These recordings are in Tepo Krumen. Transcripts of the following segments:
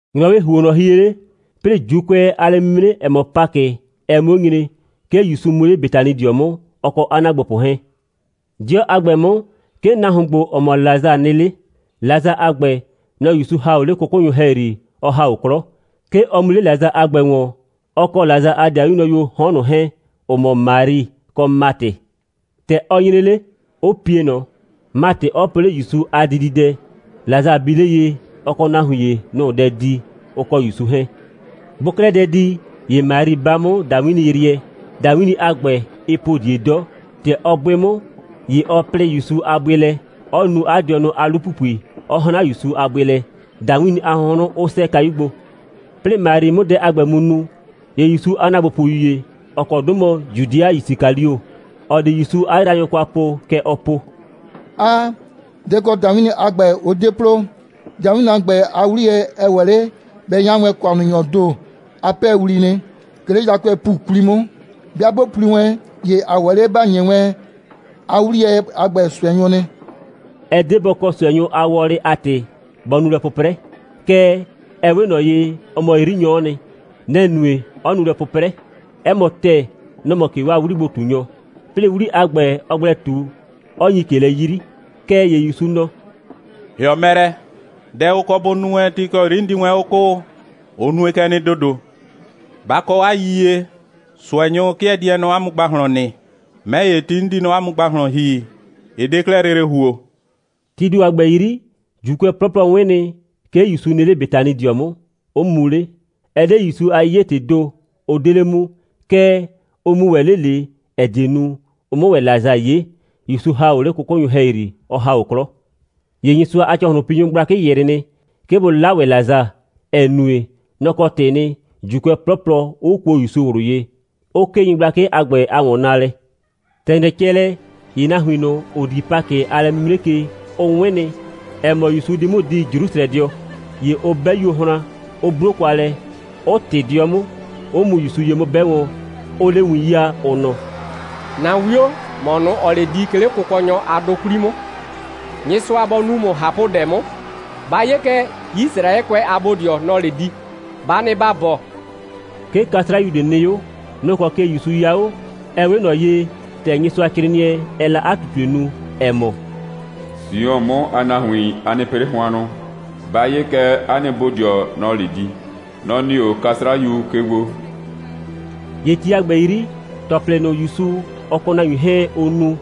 ‑Nyrɔwɩɩ ‑huonnɔ hie 'le, 'plɩɩ ‑Juukʋɛ a lɛ'mimre, ‑ɛ mɔ Pakɩ, ɛ 'mʋ 'o nyre, 'ke ‑Yusu mu 'le Betanidɩɔ 'mʋ, ɔ kɔ 'a ‑naagbopʋ 'hɛɛn. 'Dɩɔ a ‑gbɛ 'mʋ, 'ke nahuon ‑gbo, ‑ɔ mɔ Lasa nɩ 'le. Lasa a ‑gbɛ, nɔ‑ ‑Yusu ‑ha o 'le 'kʋkʋnyʋ ‑hɛyri, ɔ ‑ha o 'klɔ. 'Ke ɔ mu 'le Lasa a ‑gbɛ ‑wɔn, ɔ kɔ Lasa a ‑dɩayuo nyrʋyuoo 'hɔn ꞊nʋ 'hɛɛn, ‑ʋ mɔ Mari kɔ Matɩ. ‑Tɛ ɔ nyre 'le, 'ʋ pie ꞊nɔ, Matɩ 'ɔ po 'le ‑Yusu a dididɛ. Lasa bi 'le ye, ɔ kɔ nahuin ‑ye, nʋ‑ʋ dɛ di, ʋ kɔ ‑Yusu 'hɛɛn. Bʋʋ 'klɛɛ dɛ di, ‑ye Mari 'ba 'mʋ ‑dawinniyrɩɛ. ‑Dawinni a ‑gbɛ, ɩɩ po ꞊die 'dɔ. ‑Tɛ ɔ 'bʋɩ 'mʋ, ‑ye ɔ plɩɩ ‑Yusu a bʋɩ lɛ, 'ɔ nu 'a dɩɔnʋ a 'lu‑pupui, 'ɔ 'hran ‑Yusu a bʋɩ lɛ, ‑dawinni a hʋnhrʋn 'ʋ 'sɛɛ kayu gbo. 'Plɩɩ Mari 'mʋ dɛ a ‑gbɛ mu nu, ‑ye ‑Yusu a ‑naagbopʋyu ‑ye, ‑ɔ kɔ 'dʋ mɔ Judɩa Yisikalio, ‑ɔ di ‑Yusu 'a yraanyʋ kwa po, kɛ ɔ po: «'Aa. Dɛ‑ kɔ ‑dawinni a ‑gbɛ, ʋ 'de plo? ‑Dawinni a ‑gbɛ a 'wliyɛ, ɛ ‑wɛ 'le bɛ 'ya wɛn ‑kʋannunyɔɔ ‑do a 'pɛɛwli nɩ, 'ke 'le yakʋɛɛ ‑pu 'kwli 'mʋ. 'Bɩa 'bʋ pli wɛn, ‑ye ‑a ‑wɛ 'le ‑ba ‑nyi wɛn 'a 'wliyɛ a ‑gbɛ ꞊sʋɛnyʋ nɩ.» Ɛ 'de bɔ kɔ ꞊sʋɛnyʋ a wɔlɩ a ‑tɩ, bɔ nu lɛ 'pʋprɛ. Kɛɛ, ɛ 'we ꞊nɔ ye, ɔ mɔ 'yrinyɔ'ɔ nɩ. Nɛ‑ nue, 'ɔ nu lɛ 'pʋprɛ. 'Ɛ mɔ ‑tɛɛ, nɔ‑ mɔ ꞊ke 'waa 'wligbo꞊tunyɔ, 'plɩɩ 'wli a ‑gbɛ, ɔɔ gblɛ ꞊tu, 'ɔ nyi ꞊ke lɛ 'yri. Kɛɛ ‑ye ‑Yusu nɔ: «‑Hɩɔ mɛ lɛ! Dɛ ʋ kɔ bʋ nu wɛn ti ‑kɔ 'yri 'n di wɛn 'o 'kʋʋ, ɔ nue kɛ nɩ ‑dodo. Ba kɔ 'a yiyie, ꞊sʋɛnyʋ 'kɩɛ die nɔ 'a mʋ ‑gbahlɔn nɩ. 'Mɛ ‑ye, ti 'n di nɔ 'a mʋ ‑gbahlɔn ‑hi, ɩ 'de 'klɛɛ lele ‑huo.» Tii ‑do a ‑gbɛ 'yri, ‑Juukʋɛ 'plɔplɔ 'wɩn nɩ, 'ke ‑Yusu nɩ 'le Betanidɩɔ 'mʋ, 'ʋ mu 'le. Ɛ 'de ‑Yusu a 'yiye‑tɩɩ ‑do, ʋ 'de 'le mu. Kɛɛ, ʋ mu ‑wɛ 'le ꞊le, ‑ɛ die nu, ʋ 'mʋ ‑wɛ Lasa 'ye, ‑Yusu ‑ha o 'le 'kʋkʋnyʋ ‑hɛyri, ɔ ‑ha o 'klɔ. ‑Ye Nyɩsʋa a ‑cɔhlʋnpinyʋ gblakɩ ‑yrɩ nɩ, 'ke bʋ 'la ‑wɛ Lasa, ‑ɛ nue, nɔ‑ kɔ ‑tɩɩ nɩ, ‑Juukʋɛ 'plɔplɔ 'ʋ kuo ‑Yusu ꞊wlʋ ye, 'ʋ 'kee nyɩgblakɩ a ‑gbɛ a ‑wɔnnaalɛ. ‑Tɛ ‑nyrɛ cɛ lɛ, ‑ye nahuin ꞊nʋ, ‑ʋ di Pakɩ a lɛ'mimre ke, ʋ 'wɩn nɩ, ‑ɛ mɔ, ‑Yusu di 'mʋ di Jrusrɛdɩɔ. ‑Ye ʋ 'bɛ yuohran, 'ʋ 'blo kwa lɛ, 'ʋ ꞊tɩ 'dɩɔ 'mʋ, 'ʋ mu ‑Yusu ye 'mʋ 'bɛ wɔn, 'ʋʋ 'le win 'yaa, ʋ nɔ: «‑Na 'wio, ‑mɔ ꞊nʋ, ‑ɔɔ 'le di, 'ke 'le Kʋkɔnyɔ a 'dʋ 'kwli 'mʋ. Nyɩsʋa bɔ nu ‑mʋ ꞊hapʋdɛ 'mʋ. Ba 'ye kɛ, Yisraɛkʋɛ a bodɩɔ, nɔ‑ɔ 'le di. Ba nɩ ‑ba bɔɔ.» 'Ke 'kasrayu ꞊de nɩ 'o. Nʋ‑ kɔ ke ‑Yusu 'ya 'o, ‑ɛ 'we ꞊nɔ ye, ‑tɛ Nyɩsʋacrɩɩnɩɛ, ɛɛ la 'a ꞊tutue nu, ‑ɛ mɔ: «Sion (Jrusrɛ) 'mʋ a nahuin, a nɩ pɩ 'le hʋannʋ. Ba 'ye kɛ, 'a nɩ bodɩɔ, nɔ‑ɔ 'le di. Nɔ‑ nɩ 'o 'kasrayu ke gbo.» ‑Ye ti a ‑gbɛ 'yri, ‑tɔplɩ ꞊nʋ, ‑Yusu, ɔ kɔ nahuin 'hɛɛn, ʋʋ nu,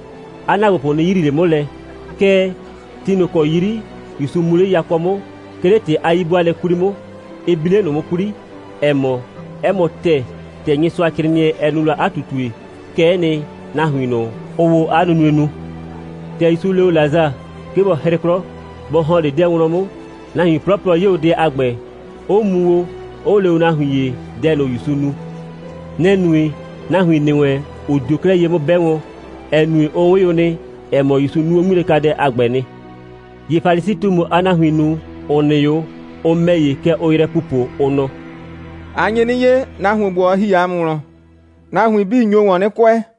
'a ‑naagbopʋ 'nɩ yrii ꞊le 'mʋ lɛ. Kɛɛ, ti ꞊nʋ ‑kɔ 'yri ‑Yusu mu 'le yakɔ 'mʋ, 'ke 'le ‑tɩ a 'yi'bʋaalɛ 'kwli 'mʋ, ɩ bi 'le ꞊nʋ 'mʋ 'kwli, ‑ɛ mɔ, 'ɛ mɔ ‑tɛɛ, ‑tɛ Nyɩsʋacrɩɩnɩɛ, ɛ nu la 'a ꞊tutue, kɛ'ɛ nɩ, nahuin ꞊nʋ, ʋʋ o 'a nunue nu. ‑Tɛ ‑Yusu le o Lasa, 'ke bɔ 'hrɩ 'klɔ, bɔ ‑hɔn 'le 'dɛɛ wlɔn 'mʋ, nahuin 'plɔplɔ 'ye o dɛ a ‑gbɛ, 'ʋ mu o, 'ʋ le o nahuin ‑ye dɛ ꞊nʋ, ‑Yusu nu. Nɛ‑ nue, nahuin ‑nɩ wɛn 'ʋ dio 'klɛɛ ye 'mʋ 'bɛ wɔn, ‑ɛ nue, ʋ 'wɩn o nɩ, ‑ɛ mɔ, ‑Yusu nu o 'ŋmilɛkadɛ a ‑gbɛ nɩ. ‑Ye Falisi꞊tumu a nahuin ꞊nʋ, ‑ʋ nɩ 'o, ʋ ‑mɛ ‑ye, kɛ ʋʋ yrɛ pupo, ʋ nɔ: «A nye 'nɩ 'ye, nahuon ‑gbo, ɔ ‑hi ‑a mʋ wlɔn. Nahuin 'bii nyo ‑wɔn 'nɩ kʋɛ.»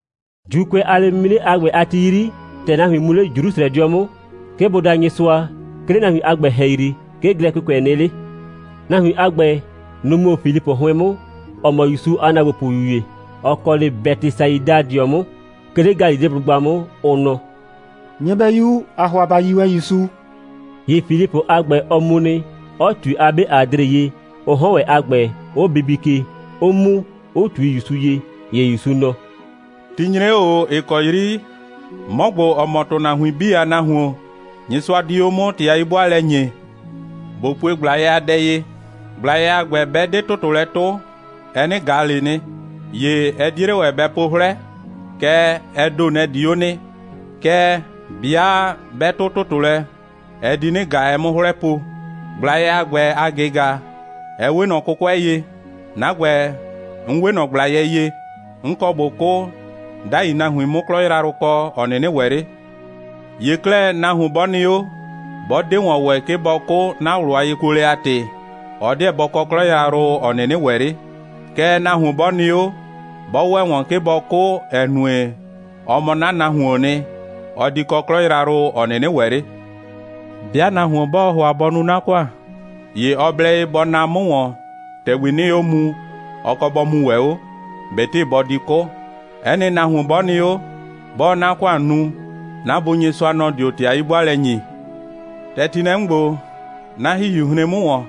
‑Juukʋɛ a lɛ'mimre a ‑gbɛ a ti 'yri, ‑tɛ nahuin mu 'le Jrusrɛdɩɔ 'mʋ, 'ke bʋ da Nyɩsʋa, 'ke 'le nahuin a ‑gbɛ ‑hɛyri, 'ke Glɛkɩkʋɛ nɩ 'le. Nahuin a ‑gbɛ, nʋ‑ mu 'o Filipʋ 'hʋɩn 'mʋ, ‑ɔ mɔ ‑Yusu a ‑naagbopʋyu ‑ye, ‑ɔ kɔ 'le Bɛtɩsaidadɩɔ 'mʋ, 'ke 'le Galileblʋgba 'mʋ, ʋ nɔ: «Nyɩbɛyu, ‑aa ‑hʋa ‑ba yi wɛn ‑Yusu.» ‑Ye Filipʋ a ‑gbɛ, ɔ mu nɩ, 'ɔ ꞊tui 'a 'be Adre ye, ʋ 'hɔn a ‑gbɛ 'ʋ bibi ke, 'ʋ mu, 'ʋ ꞊tui ‑Yusu ye. ‑Ye ‑Yusu nɔ: «Ti nyre 'o ꞊o, ‑ɩ kɔ 'yri 'mɔ ‑gbo, ‑ɔ mɔ ‑tʋnahuin 'bii a Nahuon, Nyɩsʋa di 'o 'mʋ ‑tɩ a 'yi'bʋaalɛ ‑nyee. ꞊Bo pue ꞊gblayɛ a dɛ ye. ꞊Gblayɛ a ‑gbɛ 'bɛ 'de ‑tʋtʋ lɛ 'tʋ, ɛ 'nɩ ꞊ga ꞊le nɩ, ‑ye ɛ 'die 'le ‑wɛ bɛ po 'hlɛ, kɛɛ, ɛ ‑do, nɛ‑ di 'o nɩ. Kɛɛ, 'bɩa 'bɛ 'tʋ ‑tʋtʋ lɛ, ɛ di 'nɩ ꞊ga, ɛ 'mʋ 'hlɛ po. ꞊Gblayɛ a ‑gbɛ a ꞊gɩga, ɛ 'we ꞊nɔ 'kʋkʋɛ ye. 'Na ‑gbɛ, 'n 'we ꞊nɔ ꞊gblayɛ ye. 'N kɔ ꞊bo 'kʋ, 'dai nahuin 'mʋ 'klɔ yrayrʋ kɔ, ‑ɔ 'nɩnɩ ‑wɛ 'le. ‑Ye 'klɛɛ, nahuon 'bɔ nɩ 'o, 'bɔ 'de ‑wɔn ‑wɛ, 'ke bɔ 'kʋ, 'na ꞊wlʋ a yekuolɛ a ‑tɩ, ɔ 'deɛ bɔ kɔ 'klɔ yrayrʋ, ‑ɔ 'nɩnɩ ‑wɛ 'le. Kɛɛ, nahuon 'bɔ nɩ 'o, 'bɔ ‑wɛ ‑wɔn, 'ke bɔ 'kʋ, ‑ɛ nue, ɔ mɔ 'na nahuoon nɩ, ɔ di kɔ 'klɔ yrayrʋ, ‑ɔ 'nɩnɩ ‑wɛ 'le. 'Bɩa nahuon 'bɔɔ ‑hʋa bɔ nu 'na ‑kʋan, ‑ye ɔ blɛ ye bɔ naa 'mʋ ‑wɔn, ‑tɛgbi 'nɩɩ 'o muu, ɔ kɔ bɔ muu ‑wɛ 'o, ꞊betɩ bɔ di 'kʋ. 'Ɛ nɩ nahuon 'bɔ nɩ 'o, 'bɔɔ 'na ‑kʋan nu, 'na Bu Nyɩsʋa, nɔ‑ dio ‑tɩ a 'yi'bʋaalɛ ‑nyi.» «‑Tɛ ti nɩ lɛ 'mʋ ‑gbo, 'na ‑hihiu hren 'mʋ ‑wɔn.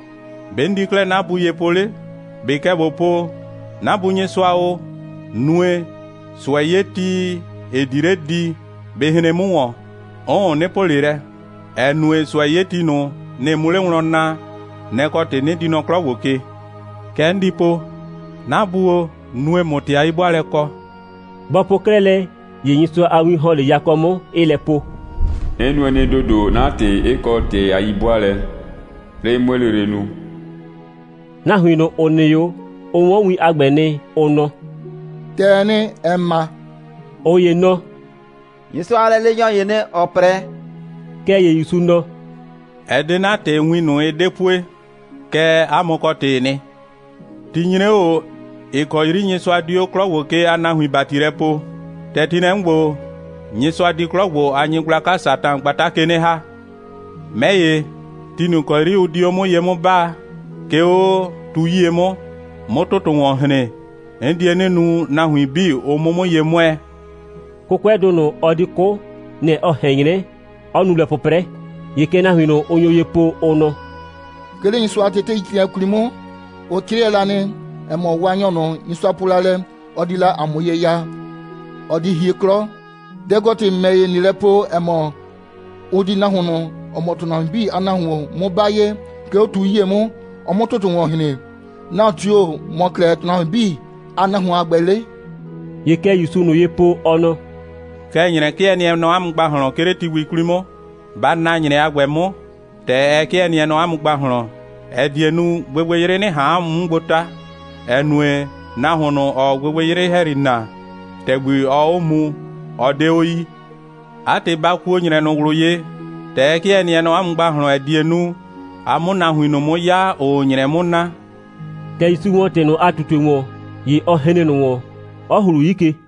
‑Be' 'n di 'klɛɛ 'na Bu ye po 'le? ꞊Be kɛ ꞊bo po: 'Na Bu Nyɩsʋa o, nue, ꞊sʋɛ'yeti, ‑ɩ di 'le di, bɩ hren 'mʋ ‑wɔn. 'Ʋʋn, 'nɩ po ꞊le lɛ, ‑ɛ nue, ꞊sʋɛ'yeti ꞊nʋ, nɩ‑ 'mʋ 'le wlɔn naa. Nɛ‑ kɔ ‑tɩ 'nɩ di nɔ 'klɔ ‑gbo ke. Kɛ 'n di po: 'Na Bu o, nue, ꞊mʋ ‑tɩ a 'yi'bʋaalɛ kɔ.» Bɔ po 'klɛɛ lɛ, ‑ye Nyɩsʋa a win ‑hɔn 'le yakɔ 'mʋ, 'ɩɩ lɛ po: «'N nue nɩ ‑dodo, 'na ‑tɩ 'ɩ kɔ ‑tɩ a 'yi'bʋaalɛ, 'plɩɩ 'mue lele nu.» Nahuin ꞊nʋ, ‑ʋ nɩ 'o, ʋ 'wɔn win a ‑gbɛ nɩ, ʋ nɔ: «‑Tɛɛ nɩ, ‑ɛ ma.» ꞊Ʋ ‑ye nɔ: «Nyɩsʋa a lɛleenyɔ ‑yee nɩ, ‑ɔ 'prɛ.» Kɛɛ ‑ye ‑Yusu nɔ: «Ɛ 'de 'na ‑tɩ, win ꞊nʋ, ɩ 'de pue, kɛɛ, 'a mʋ kɔ ‑tɩɩ nɩ. Ti nyre 'o ꞊o, ‑ɩ kɔ 'yri Nyɩsʋa di 'o 'klɔ ‑gbo ke a nahuin ‑bati lɛ poo. ‑Tɛ ti nɩ lɛ 'mʋ ‑gbo, Nyɩsʋa di 'klɔ ‑gbo a nyɩgblaka Satan gbata ke 'nɩ ‑ha. 'Mɛ ‑ye, ti ꞊nʋ ‑kɔ 'yri ʋ di 'o 'mʋ ye 'mʋ 'baa, 'ke 'o tu 'yie 'mʋ, 'mʋ ‑tʋtʋ ‑wɔn hren, 'n die 'nɩ nu, nahuin 'bii, ʋ 'mʋ 'mʋ ye 'mʋɛɛ.» 'Kʋkʋɛdʋ ꞊nʋ, ɔ di 'kʋ, nɛ‑ ɔ ꞊hɛn 'nyrɛ, 'ɔ nu lɛ 'pʋprɛ. ‑Ye kɛ nahuin ꞊nʋ, ʋ nyo ye po, ʋ nɔ: «'Ke 'le Nyɩsʋa a teteicrɩɩnɩɛi 'kwli 'mʋ, ʋ 'crɩɛ la nɩ, ‑ɛ mɔ, Waanyɔ ꞊nʋ, Nyɩsʋa po la lɛ, ɔ di la ‑a mʋ ye ya, ɔ di hie 'klɔ. Dɛ‑ kɔ ‑tɩ, ‑mɛ ‑ye, ꞊nɩɩ lɛ po, ‑ɛ mɔ, ʋ di nahuon ꞊nʋ, ‑ɔ mɔ ‑tʋnahuin 'bii Nahuon 'mʋ 'ba ye, 'ke 'o tu 'yie 'mʋ, ɔ 'mʋ ‑tʋtʋ ‑wɔn hren? Nahuon tio‑ mɔ 'klɛɛ ‑tʋnahuin 'bii a Nahuon a ‑gbɛ 'le?» ‑Ye kɛ ‑Yusuu ꞊nʋ ye po, ɔ nɔ: «Kɛ ‑nyrɛ 'kɩɛ nɩɛ nɔ 'a mʋ ‑gbahlɔn, 'ke 'le ti gbi 'kwli 'mʋ. Ba na ‑nyrɛ a ‑gbɛ 'mʋ, ‑tɛ ɛ 'kɩɛ nɩɛ nɔ 'a mʋ ‑gbahlɔn, ‑ɛ die nu, gbɩgbɩyrɩ 'nɩ ꞊han 'a mʋ 'mʋ gbo 'ta, ‑ɛ nue, nahuon ꞊nʋ, ‑ɔɔ gbɩgbɩyrɩ ‑hɛyri na, ‑tɛgbi ɔɔ 'o muu, ɔ 'de 'o yii. 'A ‑tɩ, ba kuo ‑nyrɛ ꞊nʋ ꞊wlʋ ye, ‑tɛ ɛ 'kɩɛ nɩɛ nɔ 'a mʋ ‑gbahlɔn, ‑ɛ die nu, a 'mʋ nahuin ꞊nʋ 'mʋ 'ya, ‑ʋʋ ‑nyrɛ 'mʋ na.» ‑Tɛ ‑Yusu ‑wɔ ‑tɩ ꞊nʋ a ꞊tutue ‑wɔn, ‑ye ɔ hren ꞊nʋ ‑wɔn, 'ɔ ‑hlu 'yi ke.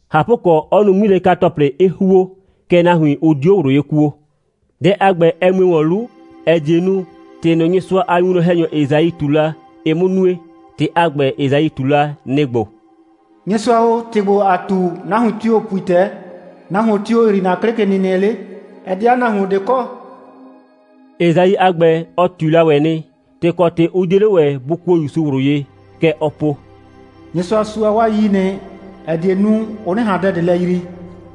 ꞊Hapʋkɔ, 'ɔ nu 'ŋmilɛka‑tɔplɩ, 'ɩ ‑huo, kɛɛ, nahuin, ʋ 'dio ꞊wlʋ ye kuo. Dɛ a ‑gbɛ, ɛ mue ‑wɔn 'lu, ‑ɛ die nu, ‑tɩ ꞊nʋ, Nyɩsʋa a winwlɔn‑hɛnyɔ Esai ꞊tu la, ɩ 'mʋ nue. ‑Tɩ a ‑gbɛ, Esai ꞊tu la, nɩ‑ ‑gbo: «Nyɩsʋa o, ‑tɩ ‑gbo, ‑aa ꞊tu, nahuon tio‑ pui ‑tɛɛ? Nahuon tio‑ yrii ‑na 'klɩkenɩnɩɛ 'le? Ɛ 'de 'a nahuon ꞊de kɔ.» Esai a ‑gbɛ, ɔ ꞊tui la ‑wɛ nɩ, ‑tɩ kɔ ‑tɩ 'ʋ 'die 'le ‑wɛ bʋ kuo ‑Yusu ꞊wlʋ ye. Kɛ ɔ po: «Nyɩsʋa sua 'waa 'yii nɩ, ‑ɛ die nu, ʋ 'nɩ ꞊han dɛ lɛ yrii,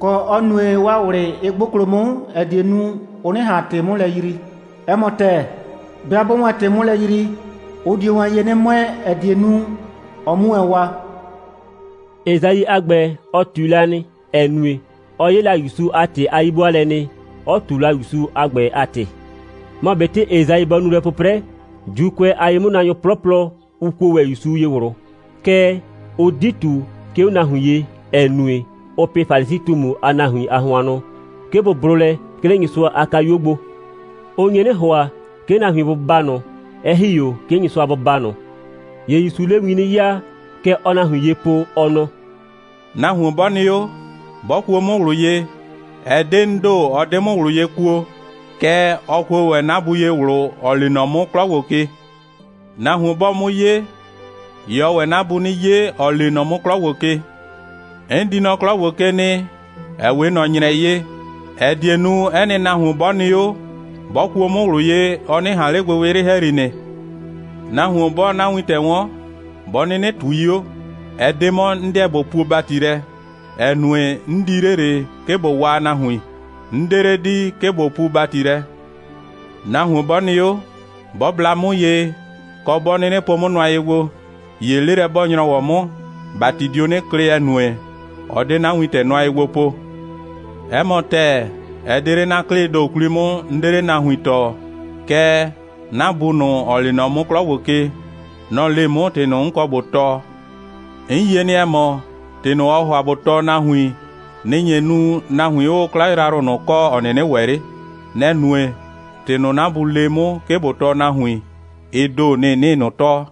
kɔ, 'ɔ nue, 'waa ꞊wlɩ 'ɩ 'gboklo 'mʋ, ‑ɛ die nu, ʋ 'nɩ ꞊han ‑tɩ 'mʋ lɛ yrii. 'Ɛ mɔ ‑tɛɛ, 'bɩa 'bʋʋ wɛn ‑tɩ 'mʋ lɛ yrii, ʋ dio wɛn ye 'nɩ 'mʋɛɛ, ‑ɛ die nu, ɔ 'mu wɛn waa.» Esai a ‑gbɛ, ɔ ꞊tui la nɩ, ‑ɛ nue, ɔ 'ye la ‑Yusu a ‑tɩ a 'yi'bʋaalɛ nɩ, 'ɔ ꞊tu la ‑Yusu a ‑gbɛ a ‑tɩ. Mɔ ꞊betɩ Esai bɔ nu lɛ 'pʋprɛ, ‑Juukʋɛ a ye'mʋnaanyʋ 'plɔplɔ, ʋ kuo ‑wɛ ‑Yusu ye ꞊wlʋ. Kɛɛ, ʋ 'di ꞊tu, 'ke 'o nahuin ye, ‑ɛ nue, ʋʋ pɩ Falisi꞊tumu a nahuin a hʋannʋ, 'ke bʋ blʋ lɛ, 'ke 'le Nyɩsʋa a kayuo gbo. Ʋ nye 'nɩ ‑hʋa, 'ke nahuin bʋ baa ꞊nʋ, 'ɛ ‑hi 'o 'ke Nyɩsʋa bɔ baa ꞊nʋ. ‑Ye ‑Yusuu 'le win 'nɩ 'yaa, kɛ ɔɔ nahuin ye po, ɔ nɔ: «Nahuon 'bɔ nɩ 'o, 'bɔ kuo 'mʋ ꞊wlʋ ye, ɛ 'de 'n ‑do, ɔ 'de 'mʋ ꞊wlʋ ye kuo, kɛɛ, ɔ kuo ‑wɛ 'na Bu ye ꞊wlʋ, ‑ɔ lee nɔ 'mʋ 'klɔ ‑gbo ke. Nahuon 'bɔɔ 'mʋ 'ye, ‑ye ɔɔ ‑wɛ 'na Bu 'nɩ 'ye, ‑ɔɔ lee nɔ 'mʋ 'klɔ ‑gbo ke. 'N di nɔ 'klɔ ‑gbo ke nɩ, ‑ɛ 'we ꞊nɔ ‑nyrɛ ye, ‑ɛ die nu, 'ɛ nɩ nahuon 'bɔ nɩ 'o, 'bɔ kuo 'mʋ ꞊wlʋ ye, ɔ 'nɩ ꞊han 'le gbɩgbɩyrɩ ‑hɛyri nɩ. Nahuon 'bɔɔ 'na wintɛ 'wɔn, 'bɔ 'nɩnɩ ꞊tui 'o, ɛ 'de 'mɔ, 'n 'deɛ ꞊bo puo ‑bati lɛ, ‑ɛ nue, 'n di 'le ꞊le, 'ke ꞊bo waa nahuin. 'N 'de 'le di, 'ke ꞊bo puu ‑bati lɛ. Nahuon 'bɔ nɩ 'o, 'bɔ bla 'mʋ ye, kɔ, 'bɔ 'nɩnɩ po 'mʋ nʋa ye gbo, ‑ye 'lelɛ'bɔɔ‑nyrɔwɔ 'mʋ, ‑bati dio 'nɩ klɩ, ‑ɛ nue, ɔ 'de 'na wintɛ nʋa ye gbo po. 'Ɛ mɔ ‑tɛɛ, ɛ 'de 'le 'na 'klɩɩ ‑do 'kwli 'mʋ, 'n 'de 'le nahuin tɔɔ, kɛɛ, 'na Bu ꞊nʋ, ‑ɔ lee nɔ 'mʋ 'klɔ ke, nɔ‑ le 'mʋ ‑tɩ ꞊nʋ, 'n kɔ ꞊bo tɔɔ. 'N yie nɩ, ‑ɛ mɔ, ‑tɩ ꞊nʋ, ɔɔ ‑hʋa ꞊bo tɔɔ nahuin, nɩ‑ nye nu, nahuin 'ʋʋ 'klɔ yrayrʋ ꞊nʋ kɔ, ‑ɔ 'nɩnɩ ‑wɛ 'le. Nɛ‑ nue, ‑tɩ ꞊nʋ, 'na Bu le 'mʋ, 'ke ꞊bo tɔɔ nahuin, ɩ ‑do, nɩ‑ 'nɩɩ ꞊nʋ tɔɔ.»